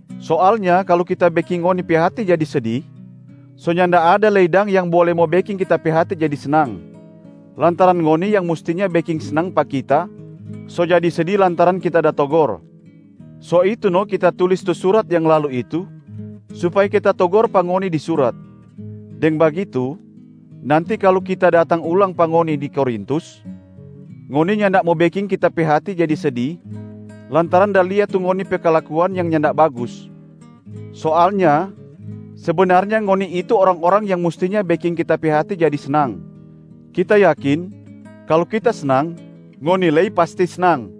Soalnya kalu kita beking ngoni pe hati jadi sedi, so nyanda ada lei dang yang bole mo beking kita pe hati jadi snang, lantaran ngoni yang mustinya beking snang pa kita so jadi sedi lantaran kita da togor. So itu no kita tulis tu surat yang lalu itu supaya kita togor pa ngoni di surat, deng bagitu nanti kalu kita datang ulang pa ngoni di Korintus, ngoni nyanda mo beking kita pe hati jadi sedi lantaran da lia tu ngoni pe kalakuan yang nyanda bagus. Soalnya sebenarnya ngoni itu orang-orang yang mustinya beking kita pe hati jadi snang. Kita yakin kalu kita snang, ngoni lei pasti snang.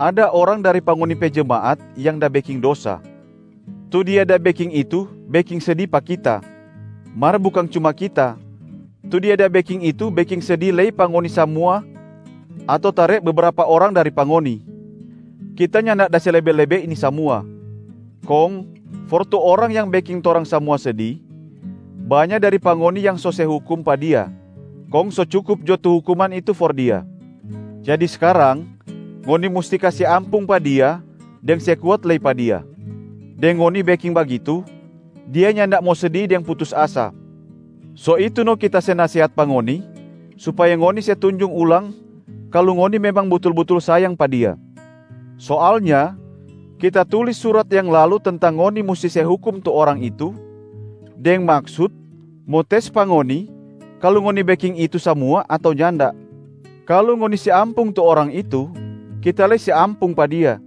Ada orang dari pa ngoni pe jemaat yang da beking dosa. Tu dia da beking itu beking sedi pa kita, mar bukang cuma kita, tu dia da beking itu beking sedi lei pa ngoni samua ato tare bebrapa orang dari pa ngoni. Kita nyanda da se lebe-lebe ini samua. Kong for tu orang yang beking torang samua sedi, banya dari pa ngoni yang so se hukum pa dia, kong so cukup jo tu hukuman itu for dia. Jadi skarang, ngoni musti kase ampung pa dia deng se kuat lei pa dia. Deng ngoni beking bagitu, dia nyanda mo sedi deng putus asa. So itu no kita se nasehat pa ngoni, supaya ngoni se tunjung ulang kalu ngoni memang butul-butul sayang pa dia. Soalnya kita tulis surat yang lalu tentang ngoni musti se hukum tu orang itu deng maksut mo tes pa ngoni kalu ngoni beking itu samua ato nyanda. Kalu ngoni se ampung tu orang itu, kita lei se ampung pa dia.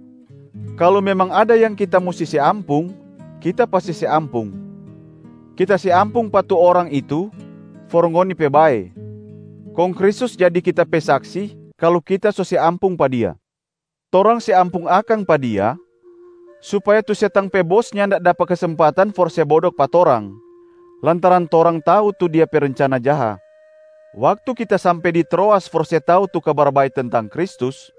Kalu memang ada yang kita musti se ampung, kita pasti se ampung. Kita se ampung pa tu orang itu for ngoni pe bae, kong Kristus jadi kita pe saksi kalu kita so se ampung pa dia. Torang se ampung akang pa dia supaya tu setang pe bos nyanda dapa kesempatan for se bodok pa torang, lantaran torang tau tu dia pe rencana jaha. Waktu kita sampe di Troas for se tau tu Kabar Bae tentang Kristus,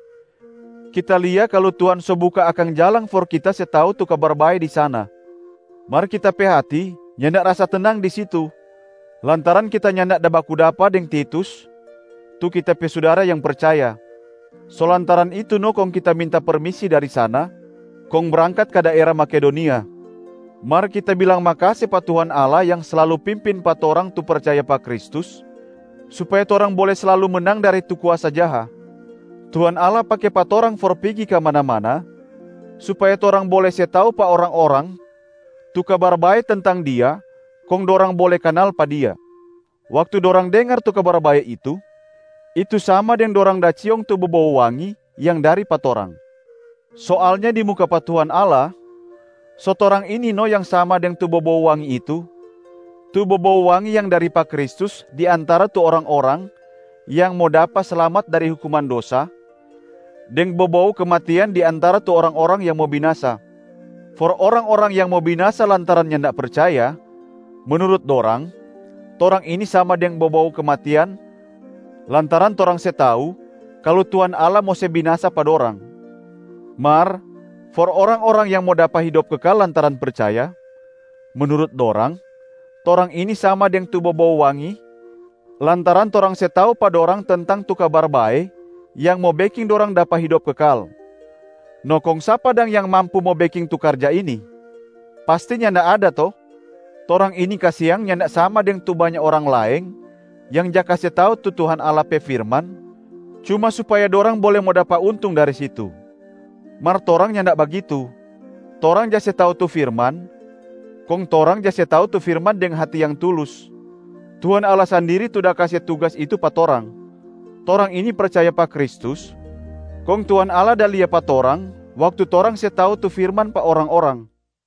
kita lia kalu Tuhan so buka akang jalang for kita se tau tu Kabar Bae di sana. Mar kita pe hati nyanda rasa tenang di situ, lantaran kita nyanda da baku dapa deng Titus tu kita pe sudara yang percaya. So lantaran itu no kong kita minta permisi dari sana kong brangkat ka daera Makedonia.a Mar kita bilang makase pa Tuhan Allah yang slalu pimpin pa torang tu percaya pa Kristus supaya torang bole slalu menang dari tu kuasa jaha. Tuhan Allah pake pa torang for pigi kamana-mana supaya torang bole se tau pa orang-orang tu Kabar Bae tentang Dia kong dorang bole kanal pa Dia. Waktu dorang dengar tu Kabar Bae itu, itu sama deng dorang da ciong tu bobou wangi yang dari pa torang. Soalnya di muka pa Tuhan Allah, so torang ini no yang sama deng tu bobou wangi itu, tu bobou wangi yang dari pa Kristus di antara tu orang-orang yang mo dapa slamat dari hukuman dosa, deng bobou kematian di antara tu orang-orang yang mo binasa. For orang-orang yang mo binasa lantaran nyanda percaya, menurut dorang, torang ini sama deng bobou kematian lantaran torang se tau kalu Tuhan Allah mo se binasa pa dorang. Mar for orang-orang yang mo dapa hidop kekal lantaran percaya, menurut dorang, torang ini sama deng tu bobou wangi lantaran torang se tau pa dorang tentang tu Kabar Bae yang mo beking dorang dapa hidop kekal. No kong sapa dang yang mampu mo beking tu karja ini? Pasti nyanda ada to? Torang ini kasiang nyanda sama deng tu banya orang laeng yang ja kase tau tu Tuhan Allah pe firman cuma supaya dorang bole mo dapa untung dari situ. Mar torang nyanda bagitu, torang ja se tau tu firman, kong torang ja se tau tu firman deng hati yang tulus. Tuhan Allah sandiri tu da kase tugas itu pa torang. Torang ini percaya pa Kristus kong Tuhan Allah da lia pa torang waktu torang se tau tu firman pa orang-orang.